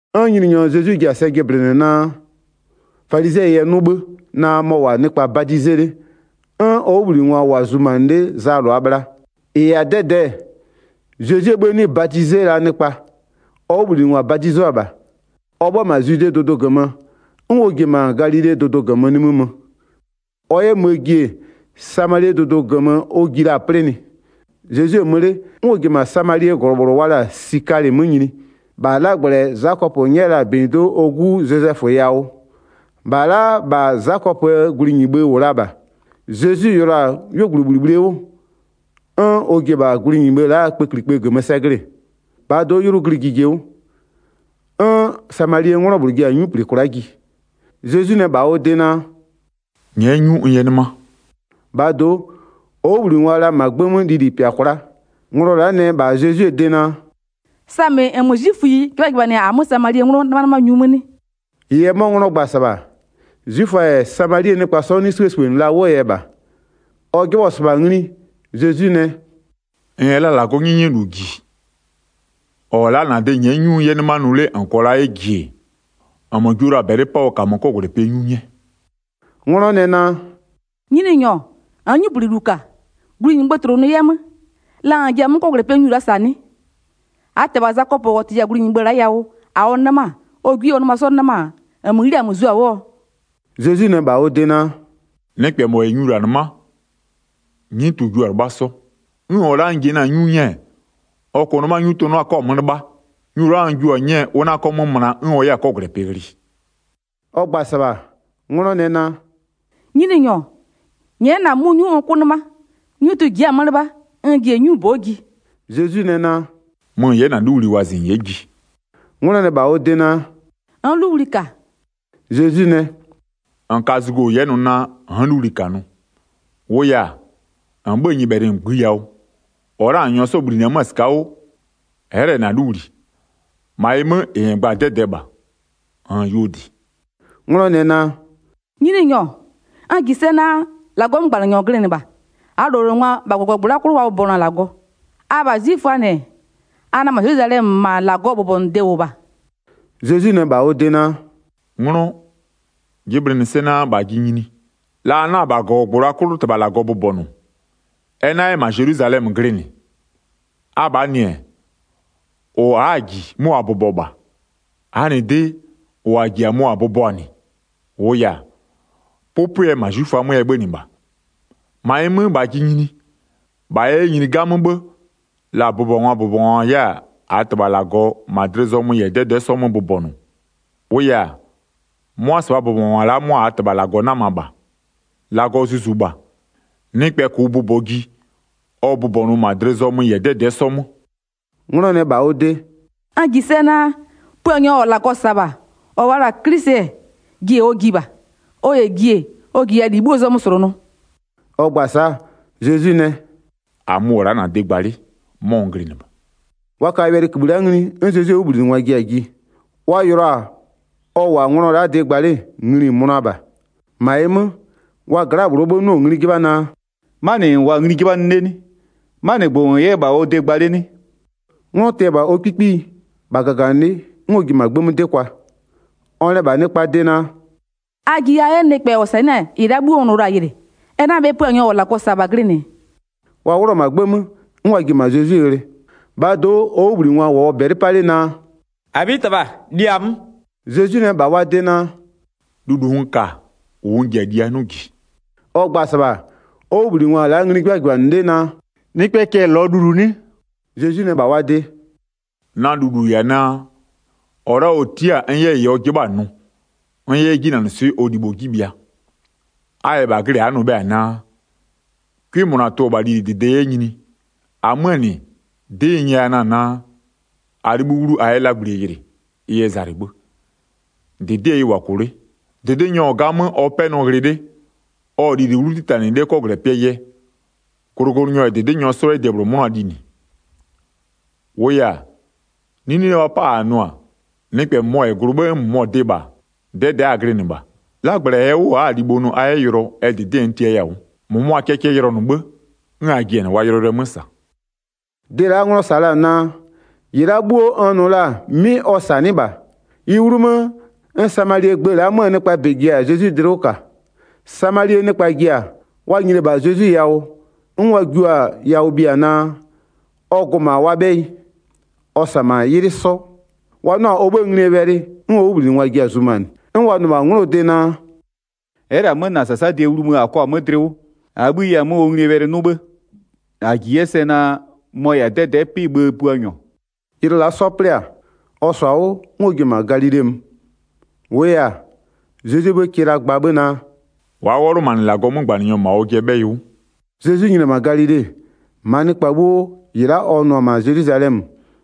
'N Nyininyɔ Zezwi ji-a sɛ jɩblɩnɩ naa falizɩɛ yɛ 'nʋ 'bhë naa mɔ-ɔ -wʋ-a nɩkpa badize 'le, 'n ɔ 'wʋbhlinɩngwa -wʋ-a zumanɩ 'le Zaa -lʋaa bhla. 2-Ɩ -yɛ-a 'dɛdɛɛ, Zezwie 'bhë 'nɩ badize la nɩkpa, ɔ 'wʋbhlinɩngwa badizʋa -bha. Ɔ 'bhö-ö -ma Zwidee dʋdʋ -gömö, 'n ɔ ji-e -ma Galilee dʋdʋ -gömö nimï mö. Ɔ 'yɛ möö ji-e, Samalie dʋdʋ -gömö ɔ ji la-a 'plɩnɩɛ. Zezwi-e mö 'le, 'n ɔ ji-e -ma Samalie -glɔ -bhlʋ wa la-a Sikalɩ 'mö nyini, -bha 'lagblɛ -ɛ Zakɔpö 'nyɛ la-a -benyido'o ɔ 'gu Zozɛfö yawʋ. 6-Bha la'a -bha Zakɔpöö glunyibhë -wʋ la -bha. Zezwi yʋlɔ-a 'yuogblʋbhlibhlie 'wʋ, 'n ɔ ji-e -bha glunyibhë la'aa kpëklikpë -gömö sɛ glɩ-ɩ. -Bhaa do'o, 'ylʋ glɩ jije 'wʋ. 'N Samalie 'nglɔ -bhlʋ ji-a 'nyu -pli kwla'a ji. Zezwi nɛ -bha ɔ de naa: “Nyɛ'ɛ 'nyu n 'yɛ 'nɩma.” 8-Bhaa do'o, ɔ 'wʋbhlinɩngwa-a la -ma 'gbë 'mö lili -pɩa kwla'a. Nglɔ la'a nɛ -bha Zezwie de naa: “Samɩ -nmö 'zwiföyi 'jɩbhajɩbhanɩ-a -amö Samalie 'nglɔ 'nɩmanɩmanyu 'mö 'nɩ?” -Wʋʋ yɛ 'mɔ 'nglɔ gba-a -sɩbha, 'zwiföa -yɛ Samalie nɩkpa 'sɔ 'nɩ 'sibhësibhënɩ la 'wʋɔ yɛ -bha. Ɔ 'jɩbhɔ-ɔ -sɩbha ngli, Zezwi nɛ: “-N -yɛ la -Lagɔɔ 'nyɛnyɛlu -ji, -ɔ -wʋ-ɔ la'a -na de nyɛ'ɛ 'nyu n 'yɛ 'nɩma nʋ 'le -n -kɔɔ la 'yɛ -ji-e, -nmö jio la-a -bɛlɩ 'paa ɔ -kamö la 'kɔgwlɛpɩɛ 'nyu 'nyɛ.” 'Nglɔ nɛ naa: “Nyininyɔ, -nn 'nyuplinɩlu -ka, glunyibhë tlʋnʋ 'yɛ 'mö, la -n ji-a 'mʋ 'kɔgwlɛpɩɛ nyu la'a -saa 'nɩ? 12-Aa -tɩbha Zakɔpö -ɔ -tɩya-a glunyibhë la'a yawʋ -a ɔ 'nɩma-a, ɔ 'gwie -yɛ ɔ nɩma 'sɔ 'nɩma-a, -nmö 'ghli-a -nmö zio-a 'wʋɔ?” Zezwi nɛ -bha ɔ de naa: “Nɩkpɛ -mɔ -yɛ nyu -la 'nɩma, 'nyutʋ-ʋ jio-a 'lɩbhaa 'sɔ. 'N -ɔ la'a n ji-e na-a 'nyu 'nyɛɛ, ɔ -kʋʋ 'nɩma 'nyutʋ 'na 'kɔ-a 'mö 'lɩbha. Nyu la'a n jio-a 'nyɛɛ, ʋ 'na 'kɔ 'mö möna 'n ɔ 'yɛ-a 'kɔgwlɛpɩ ghlɩ.” Ɔ gba-a -sɩbha, 'nglɔ nɛ naa: “Nyininyɔ, nyɛ'ɛ na-a 'mʋ 'nyu n 'kʋ 'nɩma, 'nyutʋ ji'i-a 'mö 'lɩbha n ji-e 'nyubo'o ji.” Zezwi nɛ naa: “Mö -n 'yɛ -na 'luwli wɔzɩ -n 'yɛ ji.” 'Nglɔ nɛ -bha ɔ de naa: “N'n 'luwli -ka.” Zezwi nɛ: “-N ka zugo -n 'yɛ nʋ: N'n 'luwli -ka nʋ. 18-Wʋʋ yɛ-a, -n 'bhö-ö nyɩbhɛlɩ -ngbï yawʋ, -ɔ la'a -ɔ -n -nyɔɔ 'sɔ -bhlinɩ-ɛ 'mö-ö -la -sɩka'a 'wʋ, ɛ'ɛ -lɛ -na 'luwli. -Ma ɩ 'mö, -ɩ -n gba-a 'dɛdɛɛ -bha, -nn-n yuo -dɩ.” 'Nglɔ nɛ naa: “Nyininyɔ, n -ji sɛ naa: -Lagɔɔ 'mögbanɩnyɔ -n glɩnɩ -bha. 20-Aa -lowlengwa, -bha -gɔgɔgbʋ la'a 'klʋ wa bʋbɔnʋ-a -Lagɔ, abha 'zwiföaa -nɩ, a nɛ -ma Zelwizalɛmö -ma -Lagɔɔ bʋbɔnʋde -wʋ -bha.” Zezwi nɛ -bha ɔ de naa: “'Nglɔ, jɩblɩnɩ sɛ naa, -bha ji nyini, la a 'na-a -bha -gɔgɔgbʋ -la 'klʋ -Tɩbha -Lagɔ bʋbɔnʋ, ɛ 'na 'yɛ -ma Zelwizalɛmö glɩnɩ. Abhaa -nɩ-ɛ, -ʋ a'a-a -ji 'mʋ a bʋbɔ -bha. -Aa -nɩ de, -ʋ -a -ji-a mʋ -a bʋbɔ-a -nɩ, -wʋʋ yɛ-a, 'pʋpʋɛ -ma 'zwiföa 'mö ɛ 'bhönɩ -bha. 23-Ma ɩ 'mö, -bha ji nyini, -bha yɛ 'yɛ nyini 'gamö 'bhë, la bʋbɔngwaa -bʋbɔngwa 'yɛ-a -aa -Tɩbha -Lagɔ -ma dlɩ zɔmö -yɛ 'dɛdɛ'ɛ 'sɔ 'mö bʋbɔnʋ, -wʋʋ yɛ-a, 'mʋa -sɩbhaa bʋbɔngwa la'a 'mʋa -aa -Tɩbha -Lagɔ 'nama -bha. 24-Lagɔ Zuzu -bha, nɩkpɛ -kʋʋ bʋbɔɔ ji, ɔ bʋbɔnʋʋ -ma dlɩ zɔmö -yɛ 'dɛdɛ'ɛ 'sɔ 'mö.” 'Nglɔ nɛ -bha ɔ de: “N -ji sɛ naa, Puanyɔ -ɔ -Lagɔ -sa-a -bha, -ɔ wa la-a 'Klisɩ, jie ɔ ji -bha, ɔ -yɛ ji-e, ɔ -jiya -li 'bhuoo zɔmö -slʋnʋ.” Ɔ gba-a sa'a, Zezwi nɛ: “-Amö-ö -wʋ-ɔ la'a -na de gba 'le, 'mɔ n glɩnɩ -bha.” Wa ka wɛlɩkïbhï la'a ngli, 'n Zezwie 'wʋbhlinɩngwa ji-a ji. Wa yɩlɩɔ-a ɔ -wʋ-a 'nglɔɔ de gba 'le, ngli-i mönʋa -bha. -Ma ɩ 'mö, wa gla'aa -bhlʋɔ 'bhë 'nɩɔ-ɔ ngli 'jɩbha naa: “'Manɩ -n -wʋɔ-a ngli 'jɩbhanɩ 'le 'nɩ? 'Manɩgbʋ -n -wʋ 'yɛ-ɛ -bha ɔ de gba 'le 'nɩ?” 'Nglɔ tɩ-ɛ -bha ɔ 'kpikpiyi, -bha -gaganɩlɩ'ɩ, 'n ɔ ji-e -ma 'gbë 'mö 'dɩ kwa. Ɔ nɛ -bha nɩkpaa de naa: “A ji a 'yɛ nɩkpɛ -ɔ -sanɩ'ɩ-a -ɩ la'a 'bhuo n nʋ la-a yɩlɩ, ɛ 'na bhe Puanyɔ -ɔ -Lagɔ -sa-a -bha glɩnɩ?” Wa 'wlʋ-ɔ -ma 'gbë 'mö, 'n wa ji-e -ma Zezwi ghlɩ. 31-Bhaa do'o, ɔ 'wʋbhlinɩngwa -wʋɔ -bɛlɩ 'pa 'le naa: “-Abhitɩbha, li-a 'mö.” Zezwi nɛ -bha wa de naa: “Lulu n ka-a, -ʋ n ji-a lie a 'nʋ -ji.” Ɔ gba-a -sɩbha, ɔ 'wʋbhlinɩngwa-a la'a ngli 'jɩbhajɩbhanɩ 'le naa: “Nɩkpɛɛ cɛ-ɛ -lɔɔ lulu 'nɩ?” Zezwi nɛ -bha wa de: “Na lulu -yɛ-a naa, -ɔ la'a -ɔ tia'a-a n 'yɛ -ɩ ɔ 'jɩbha-a nʋ, n 'yɛ 'yɛ 'jinanɩswɩ'ɩ ɔ libho 'ji bhɩa. A -yɛ -bha glɩ, a'a nʋ bhe-a naa: 'Cʋɩ -mʋna tʋ-ɔ -bha lilidɩde 'yɛ nyinie? -Amöö -nɩ, 'dɩ n 'nyɛya na-a naa: A 'libhï 'wlu a 'yɛ 'lagblie yɩlɩ, ɩ yɛ zalɩ 'bhë, -dɩdɩɛ ɩ -wʋ-a -kʋ 'le. 36-Dɩdɩnyɔ-ɔ 'gamö ɔ 'pɛnɔ ghlɩ 'le, ɔ-ɔ lili 'wlu 'titanɩ 'le 'kɔgwlɛpɩɛ yɛ, glʋglʋnyɔ -yɛ -dɩdɩnyɔ 'sɔ 'yɛ debhlʋ 'mʋna linɩ. 37-Wʋʋ yɛ-a, 'nine wa pa-a -a nʋ-a: Nɩkpɛ -mʋmɔ -yɛ glʋ 'n nɩkpɛ -mʋmɔ dɩ -bha, 'dɛdɛ'ɛ a glɩnɩ -bha. 'Lagblɛ -ɛɛ 'wʋ a'a-a libho nʋ a 'yɛ yʋlɔ, ɛ -dɩdɩɛ n tiaya-a 'wʋ, -mʋmʋa kɛ cɛ yʋlɔnʋ 'bhë, 'n a ji-a -nɩ wa yʋlɔyʋlʋɛ 'mö -sa.” Dɩ la'a 'nglɔ -sa la-a naa, -ɩ la'a 'bhuo n nʋ la-a 'mɩ ɔ -sanɩ'ɩ -bha-a, ɩ 'wlumö 'n Samalie gbë la'a 'möö nɩkpaa -bɛ ji-a Zezwi dlɩ 'wʋ -ka. Samalie nɩkpa ji-a, wa nyini-e -bha Zezwi yawʋ-ɔ, 'n wa jio-a yawʋ bhia naa, ɔ gʋ-ʋ -ma wa 'bhɛyɩ. Ɔ -sa-a -ma 'ylɩ 'sɔ. Wa 'nʋ-a ɔ 'bhëë nglie wɛlɩ, 'n ɔ dlɩwʋkangwa ji-a zumanɩ. 'N wa nʋ-ɔ -bha 'nglɔɔ de naa: “Ɛ'ɛ -lɛ-a 'mö -na -sasadɩɛ wlumö -a kɔ-a 'mö dlɩ 'wʋ, -aa 'bhï yɛ-a 'mö ɔ nglie wɛlɩ 'nʋ 'bhë, -a -ji 'yɛ sɛ naa mɔ-ɔ -yɛ-a 'dɛdɛ'ɛ 'pɩ-ɩ bhëë Puanyɔ.” Ylɩ la'a 'sɔ 'plɩ-a, ɔ -sɔ-a 'wʋ 'n ɔ ji-a Galile mö. 44-Wʋʋ yɛ-a, Zezwie 'bhë kɩ la gba 'bhë naa: “Wa'a 'wɔlʋmanɩ -Lagɔɔ 'mögbanɩnyɔ -ma ɔjɩɛ 'bhɛyɩ 'wʋ.” Zezwi nyini-e -ma Galile-e, -maa nɩkpa 'bhuo -ɩ la'a ɔ nʋ-ɔ -ma Zelwizalɛmö,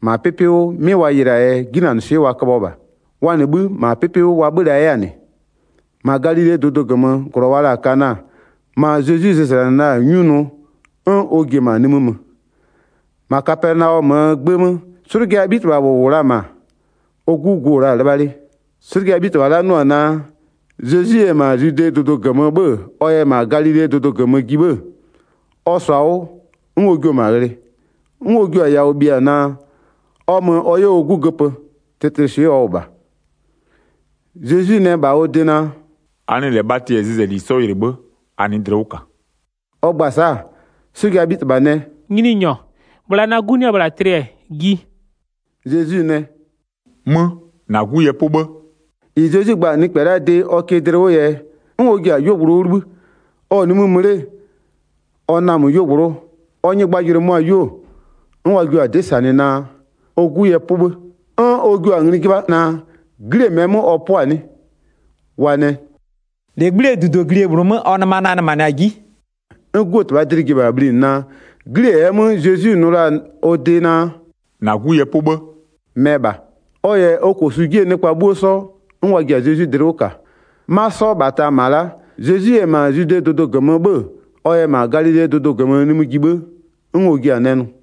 -ma 'pɩpɩ 'wʋ 'mɩ wa yɩlɩ-aa yɛ 'jinanɩswɩ'ɩ wa köbhɔ -bha. Wa -nɩ 'bhï -ma 'mɛ 'pɩpɩ 'wʋ wa 'bhö-ö la 'yɛ-a -nɩ. Zezwi yɛ 'slʋjaa 'bhitɩbha -bhlʋɔ 'gu göpö 46-Ma Galilee dʋdʋ -gömöö -glɔ wa la-a Kana, ma Zezwi zɩzlanɩ la-a 'nyu nʋ-ɔ, 'n ɔ ji-e -ma nimï mö. -Ma Kapɛnaɔmöö 'gbë 'mö, 'slʋjaa 'bhitɩbha -bhlʋ -wʋ la-a -ma, ɔ 'gu gu -wʋ la-a 'lɩbha 'le. 'Slʋjaa 'bhitɩbha la'a 'nʋ-ɔ naa, Zezwi yɛ -ma Zwidee dʋdʋ -gömö 'bhö-ö ɔ yɛ -ma Galilee dʋdʋ -gömö ji 'bhë-ë, ɔ -sɔ-a 'wʋ 'n ɔ jio-o -ma ghlɩ. 'N ɔ jio-a yawʋ bhia naa, ɔ mö ɔ 'yɛ ɔ 'gu göpö, tlɩtlɩswɩ'ɩ ɔ -wʋ -bha. Zezwi nɛ -bha ɔ de naa: “A nɩ -lɛ bhatɩ -yɛ zɩzɛli 'sɔ yɩlɩ 'bhë, a nɩ'ɩ dlɩ 'wʋ -ka.” Ɔ gba-a sa'a, 'slʋjaa 'bhitɩbha nɛ: “Nyininyɔ, bhla na 'gu 'nɩ-ɛ -bhla tlɩ, ji.” Zezwi nɛ: “Mö, -na 'gu yɛ 'pʋ 'bhë.” -Ɩ Zezwi gba-a nɩkpɛ la'aa de ɔ kɩ dlɩ 'wʋɔ yɛ, 'n ɔ ji-a 'yuogblʋ 'wʋ 'libhï. Ɔ-ɔ nimï mö 'le, ɔ namö 'yuogblʋ'ʋ, ɔ nyɩgbajʋlʋɩ möɔ-a 'yuo, 'n wa jio-a 'dɩ -sanɩ naa, ɔ 'gu yɛ 'pʋ 'bhë. 'N ɔ jua-a ngli 'jɩbha naa, 'glie -mɛɛ 'mö ɔ 'pʋ-a 'nɩ? Wa nɛ: “-Legbli'ie -dudoglie -bhlʋ 'mö ɔ nɩma nanɩmanɩ-a 'ji.” 'N 'guo -tɩbhaa dlɩ ji-e -bha bhlinɩ naa, 'glie -ɛɛ 'mö Zezwi nʋ la-a ɔ de naa: “-Na 'gu yɛ 'pʋ 'bhë” mɛ -bha. Ɔ -yɛ ɔ -kosu 'jie nɩkpa 'bhuo 'sɔ, 'n wa ji-a Zezwi dlɩ 'wʋ -ka. 'Ma 'sɔ -bhata -ma la'a, Zezwi yɛ -ma Zwidee dʋdʋ -gömö 'bhö-ö, ɔ yɛ -ma Galilee dʋdʋ -gömö nimï ji 'bhë 'n ɔ jia-a nɛ nʋ.